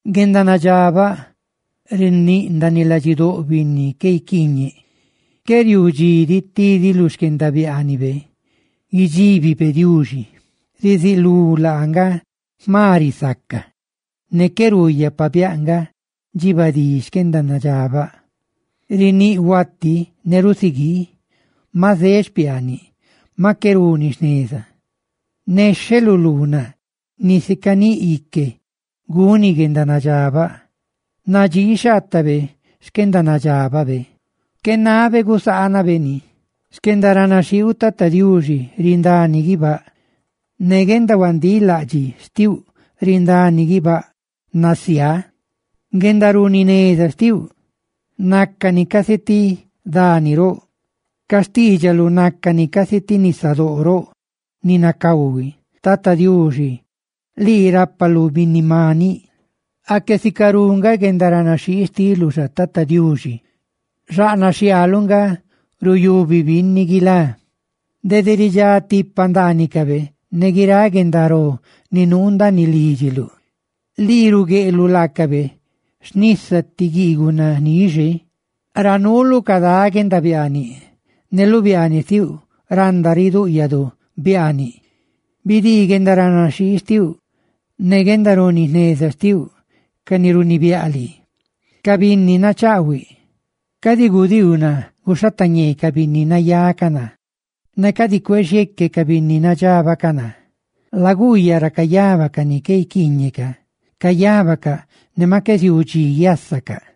Guendanadxabaꞌ riníꞌndaaniꞌ ladxidóꞌ binni qué guiquiiñeꞌ. Qué riuu dxi diꞌ tidi lu xquendabiaanibe guidxíbibe Diuxi. Ruzulú laa nga jma risaca, ne qué ruuyaꞌ pabiáꞌ nga dxibadí xquenadxabaꞌ. Riníꞌ huati ne rusugii, maꞌ zeꞌ xpiaaniꞌ, maꞌ qué runi jneza. Nexheꞌ lu luunaꞌ, nisi caníꞌ ique guni guendanadxabaꞌ; nadxixhaatabe xquendanadxababe, qué nabe gusaanabe ni. Xquendaranaxhiiuꞌ, Tata Diuxi, rindani guibáꞌ; ne guendahuandilaꞌdxiꞌa xtiuꞌ rindani guibáꞌ nasiá. Guendaruni jneza xtiuꞌ nácani casi ti dani roꞌ; ca xtiidxaluꞌ nácani casi ti nisadóꞌ roꞌ ni nacahui. Tata Diuxi, lii rápaluꞌ binni ne maniꞌ. ¡Aque sicarú nga guendaranaxhii xtiluꞌ xa, Diuxi! ¡Xaꞌnaꞌ xhiaaluꞌ nga ruyubi binni guilá! Dede ridxá tipa ndaanicabe ne guiráꞌ guendaró ni nuu ndaaniꞌ lídxiluꞌ; lii rugueꞌluꞌ laacabe xnisa ti guiiguꞌ nanixe, ra nuuluꞌ cadá guendanabani, ne lu biaaniꞌ xtiuꞌ randa ridúꞌyadu biaaniꞌ. Bidii guendaranaxhii xtiuꞌ ne guendaruni jneza xtiuꞌ ca ni runibiáꞌ lii, ca binni nachaꞌhuiꞌ. Cadi gudiiu naa guxhateñee ca binni nayá ca naa, ne cadi cuexieeque ca binni nadxabaꞌ ca naa. ¡Laguuyaꞌ ra cayaba ca ni qué guiquiiñeꞌca! ¡Cayabacaꞌ ne maꞌ qué ziuu dxi guiásaca!